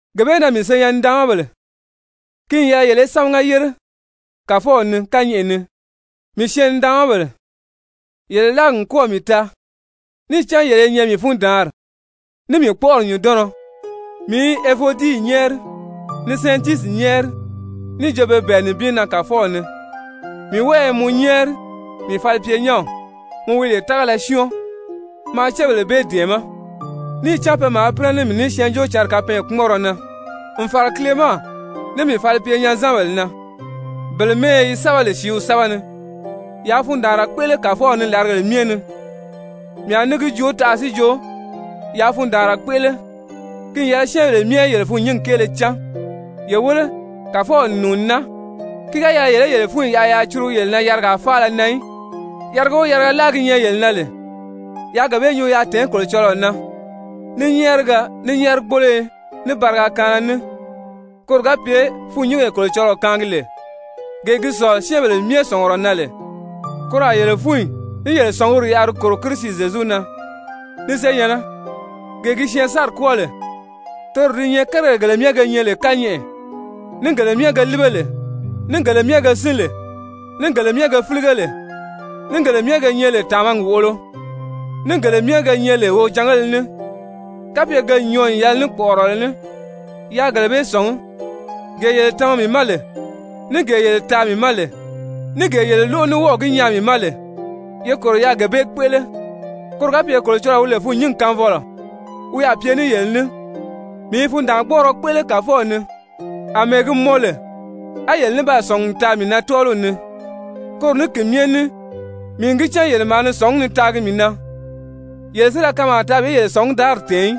Gee bee na, mii senyɛn-nidaanmabèle, ki n yɛlɛ yele í sámaga yére Kàfɔw ni kányɛʔɛ ni, mii syɛɛn-nidaanmabèle, yele láagi n kɔ́ɔ̀ mii taa, níì cán yele i nyɛ mii fundaanri, ní mii kpɔ́ʔɔri nyùndɔnnɔ! Mii i Evodii nyɛ́ɛri, ni Sɛntisyi nyɛ́ɛri níì jo pe bɛ̀ɛ nibin na Kàfɔw ni. Mii wɔ́ɔ i mɔ nyɛ́ɛri, mii falipyenyɛnw, mɔ wi lè tágala syɔ́ɔn, maa cébèle bee dɛ̀ɛmɛ́. Níì cán pe maa pínɛ ní mii ní Syɛɛnjóocǎnri kapɛɛnkpumɔnrɔ na, n fàra Kilema, ní mii falipyenyɛn-zanbèle na, bele mɛ́ɛyɛ yi sɛ́bɛ lè sìíw sɛ́bɛ ni. Yaa fundaanra kpéʔele Kàfɔw ni làrigèle myɛ ni. Mii a ní gi joo taʔa si jo: Yaa fundaanra kpéʔele. Ki n yɛlɛ syɛ́ɛnbèle myɛ í yele fûnnyingi kéele cán. Ye wéle Kàfɔw n nùuni naa. Ki ga yɛlɛ yele í yele fúnyi yaʔa yaa curugu yele na yarigaa faala na í. Yariga o yariga láa gi nyɛ yele na lè, yaa gee bee nyuu yaa tèé Kolocɔlɔɔ na ní nyɛ́ɛrigɛ, ní nyɛ́ɛrigboloyo, ní bariga kaanna ní, koro ga pye fûnnyingee Kolocɔlɔɔ kaangi lè, gee gi sɔ̀lɔ syɛ́ɛnbèle myɛ sɔ̀ngurɔ na lè, koro a yele fúnyi ní yele sɔ̀nguri yaʔa di kòro Kirisi Zyezu na. Ni senyɛ̀nnɛ, gee gi syɛɛnsanri kwɔ́ɔ lè, toro di nyɛ kérigèle gele myɛ ge nyɛ lè kányɛʔɛ, ní gele myɛ ge líbe lè, ní gele myɛ ge sín lè, ní gele myɛ ge fílige lè, ní gele myɛ ge nyɛ lè tàmagi wòʔolo, ní gele myɛ ge nyɛ lè wojangéle ní, kapye ke n nyɔɔ níì yɛlɛ ní kpɔʔɔrɔ ní, yaa kérigèle bee sɔ̀ngí. Gee yele tama mii ma lè, ní gee yele taa mii ma lè, ní gee yele lóʔo ní wɔ́ɔ̀ gi nyaa mii ma lè, ye kòro yaa gee bee kpéʔele. Koro ga pye Kolocɔlɔɔ wi lè fûnnyingi kaanfɔlɔ, wi a pye ní yele ní. Mii i fundaangbɔɔrɔ kpéʔele Kàfɔw ni, àmɛɛ gi mɔn lè, á yele ní baa sɔ̀ngi n taa mii na tɔ́ɔliw ni. Koro ní ki myɛ ní mii n gi cán yele maa ni sɔ̀ngí ni taagi mii na, yele si da kanmaa taa bi yele sɔ̀ngudaari tɛ̀ɛn í.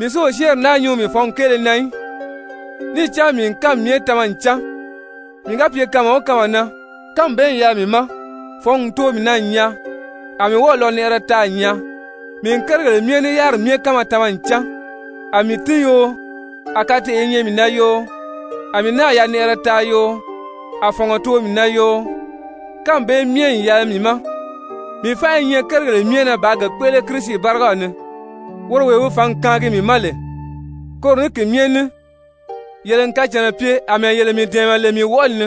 Mii si o syɛ́ɛnri naa nyuu mii fɔ̌ngi kéele na í, níì cán mii n kánmi myɛ tama n cán, mii ga pye kanma o kanma na, kánmi bee n yɛlɛ mii ma. Fɔ̌ngi n too mii na n nyaa, a mii wɔ́ɔ̀ yanɛʔɛrɛ taa n nyaa. Mii n kérigèle myɛ ní yáriri myɛ kánma tama n cán, a mii tín yoo, a kateʔe i nyɛ mii na yoo, a mii náà yanɛʔɛrɛ taa yoo, a fɔ̀ngɔ too mii na yoo, kánmi bee myɛ n yɛlɛ mii ma. Mii fánʔa i nyɛ kérigèle myɛ na bàā ge kpéʔele Kirisi bárigaw ni, woro wee wi fǎngi kaangi mii ma lè. Koro ní ki myɛ ní, yele n kacànna pye àmɛɛ yele mii dɛ̀ɛmɛ lè mii wɔʔɔli ni.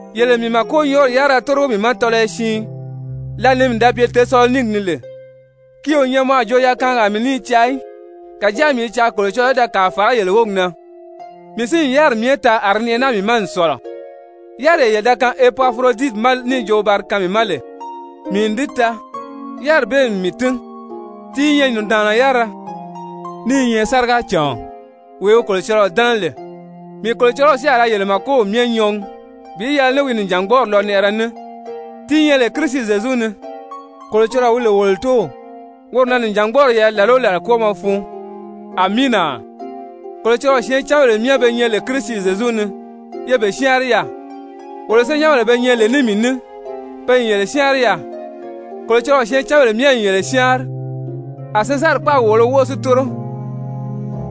Yele n mii màkonyɔɔri yárira tórigo mii ma tɔlɔyɔ siin lǎli ni mii da pye Tesaloniki ni lè. Ki o nyɛ mɔ a jo yakaangaa mii ní i caa í, kàjáa mii i caa Kolocɔlɔɔ í da kàa fàrá yele wógi na. Mii si n yáriri myɛ taa, a di nɛʔɛ naa mii ma n sɔ̀lɔ. Yáriree yele da kaan Epafuroditi ma níì jo wi ba di kaan mii ma lè, mii n di taa, yáriri bee n mii tín, ti i nyɛ nùndaanna yárira, ní i nyɛ sárigacàɔn, wee wi Kolocɔlɔɔ dɛ́nɛ lè. Mii Kolocɔlɔw si a ra yele màkow myɛ nyɔɔgi bi yɛlɛ ní wi nìjangbɔɔri lɔnɛʔɛrɛ ní ti nyɛ lè Kirisi Zyezu ni. Kolocɔlɔɔ wi lè wolo Tóow, woro na nìjangbɔɔri yɛlɛ làla o làla kwɔ́ɔmɔ fun. Amiina! Kolocɔlɔɔ syɛɛncanbèle myɛ be nyɛ lè Kirisi Zyezu ni, ye be syáanri yaà. Wolo senyɛnbèle be nyɛ lè ní mii ní, pe n yele syáanri yaà. Kolocɔlɔɔ syɛɛncanbèle myɛ n yele syáanri, a Sezari kpáagi wòolo wóʔo si tóro.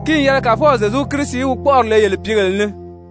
Ki n yɛlɛ Kàfɔw Zyezu Kirisi í wi kpɔ́ʔɔri le yele pìígèle ni!